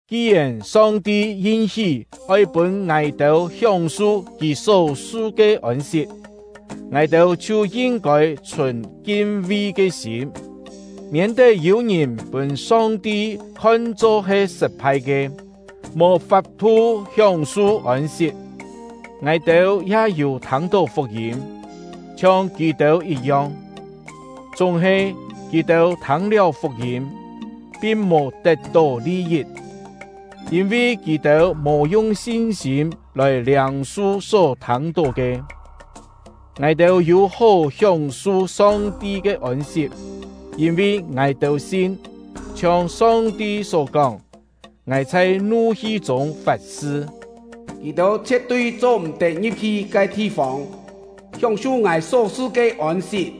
Ki-yèn Song-ti yin-hí oi pûn ngài-têu hióng-su Kì só-su ke ôn-sit, ngài-têu chhiu yin-kôi chhùn kin-vi ke sîm, miên-tet yû ngìn pûn Song-ti khon-cho he sṳt-phai ke, mò fap-thu hióng-su ôn-sit. Ngài-têu ya yû thâng-tó fuk-yîm, chhiong kì-têu yit-yong; chúng-he kì-têu thâng-liáu fuk-yîm, pin mò tet-tó li-yit, yîn-vi kì-têu mò yung sin-sîm lòi liâng-su só thâng-tó ke. Ngài-têu yû-hó hióng-su Song-ti ke ôn-sit, yîn-vi ngài-têu sin; chhiong Song-ti só kóng: Ngài chhai nu-hi chûng fat-sṳ: “Kì-têu chhie̍t-tui cho-m̀-tet ngi̍p-hi ke thi-fông hióng-su Ngài só-su ke ôn-sit!”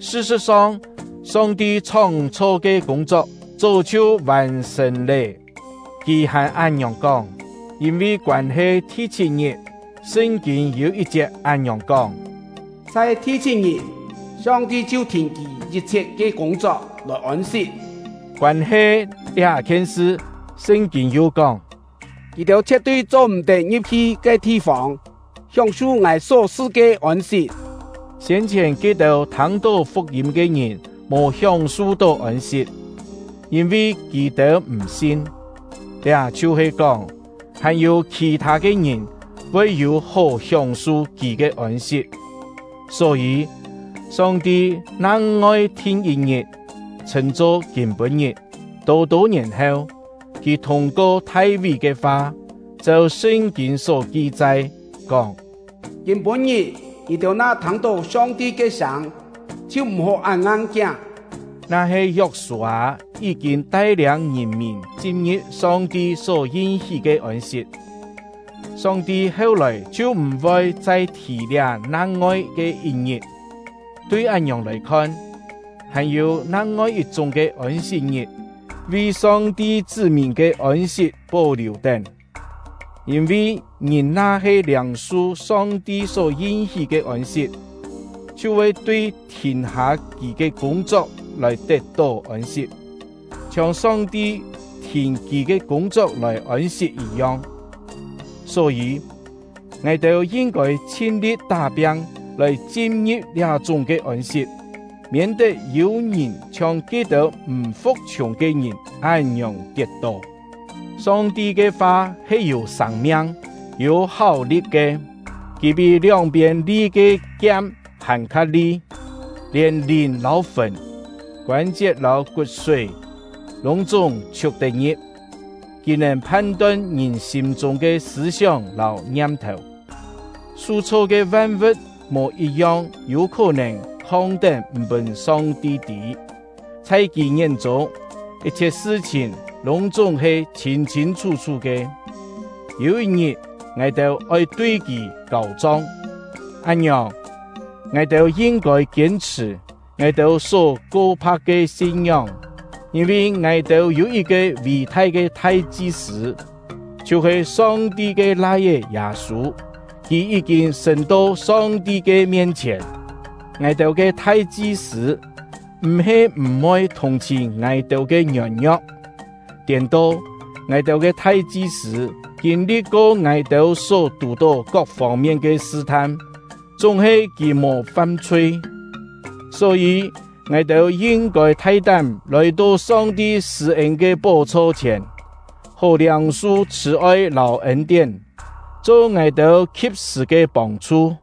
Sṳ-sṳ̍t-song, Song-ti chhóng-chho ke kûng-chok chó chhiu vàn-sṳ̀n lé, Kì hàn án-ngiòng kóng. Yîn-vi koân-he thi-chhit-ngit, Sṳn-kîn yû yit-chiet án-ngiòng kóng: “Chhai thi-chhit-ngit, Song-ti chhiu thìn Kì yit-chhiet ke kûng-chok lòi ôn-sit.” Koân-he liá-khien sṳ, Sṳn-kîn yu kóng: “Kì-têu chhie̍t-tui cho-m̀-tet ngi̍p-hi ke thi-fông hióng-su Ngài só-su ke ôn-sit!” Siên-chhièn ke-têu thâng-tó fuk-yîm ke ngìn mò hióng-su-tó ôn-sit, yîn-vi kì-têu m̀-sin; liá chhiu-he kóng, hàn-yû khì-thâ ke ngìn voi yû-hó hióng-su Kì ke ôn-sit. Só-yî, Song-ti nang-ngoi thin yit-ngit, chhṳ̂n-cho “Kîm-pû-ngit”. Tô-tô ngièn heu, Kì thûng-ko Thai-ví ke fa, cheu Sṳn-kîn só ki-chai, kóng: Kîm-pû-ngit, ngì-têu na thâng-tó Song-ti ke sâng, chhiu m̀-hó án ngang-kiáng. Na-he Yok-sû-â yí-kîn tai-liâng ngìn-mìn chin-ngi̍p Song-ti só yin-hí ke ôn-sit, Song-ti heu-lòi chhiu m̀-voi chai thì liá nang-ngoi ke yit-ngit. Tui án-ngiòng lòi khon, hàn-yû nang-ngoi yit-chúng ke “Ôn-sit-ngit” vi Song-ti chṳ́-mìn ke ôn-sit pó-liù-tén. Yîn-vi, ngìn na-he liâng-su Song-ti só yin-hí ke ôn-sit, chhiu voi tui thìn-hâ kì ke kûng-chok lòi tet-tó ôn-sit, chhiong Song-ti thìn Kì ke kûng-chok lòi ôn-sit yit-yong. Só-yî, ngài-têu yin-kôi chhin-li̍t tá-piang lòi chin-ngi̍p liá-chúng ke ôn-sit, miên-tet yû ngìn chhiong ke-têu m̀ fu̍k-chhiùng ke ngìn án-ngiòng tiet-tó. Song-ti ke fa he yû sâng-miang, yû háu-li̍t ke. Kì pí lióng-piên li ke kiam hàn-kha li; lièn lìn lâu fùn, koân-chiet lâu kut-súi, lûng-chúng chhiuk-tet-ngi̍p. Kì nèn phan-ton ngìn sîm-chûng ke sṳ̂-sióng lâu ngiam-thèu. Su-chho ke van-vu̍t mò yit-yong yû khó-nèn khong-tén m̀ pûn Song-ti tî; chhai Kì ngién-chûng, yit-chhiet sṳ-chhìn lûng-chúng he chhîn-chhîn chhú-chhú ke. Yû yit-ngit, ngài-têu oi tui Kì kâu-chong. Án-ngiòng, ngài-têu yin-kôi kiên-chhṳ̀ ngài-têu só ko-pha̍k ke sin-ngióng. Yîn-vi ngài-têu yû yit-ke ví-thai ke thai-chi-sṳ̂, chhiu-he Song-ti ke Lai-é Yâ-sû; kì yí-kîn sṳ̂n-to Song-ti ke mien-chhièn. Ngài-têu ke thai-chi-sṳ̂ m̀-he m̀-voi thùng-chhìn ngài-têu ke ngiôn-ngio̍k; tiên-to, ngài-têu ke thai-chi-sṳ̂ kîn-li̍t-ko ngài-têu só tù-tó kok fông-mien ke sṳ-tham, chúng-he kì mò fam-chhui. Só-yî, ngài-têu yin-kôi thai-tám lòi-to Song-ti sṳ̂-ên ke pó-chho chhièn, hó liâng-su chhṳ̀-oi lâu ên-tién, cho ngài-têu khi̍p-sṳ̀ ke pông-chhu.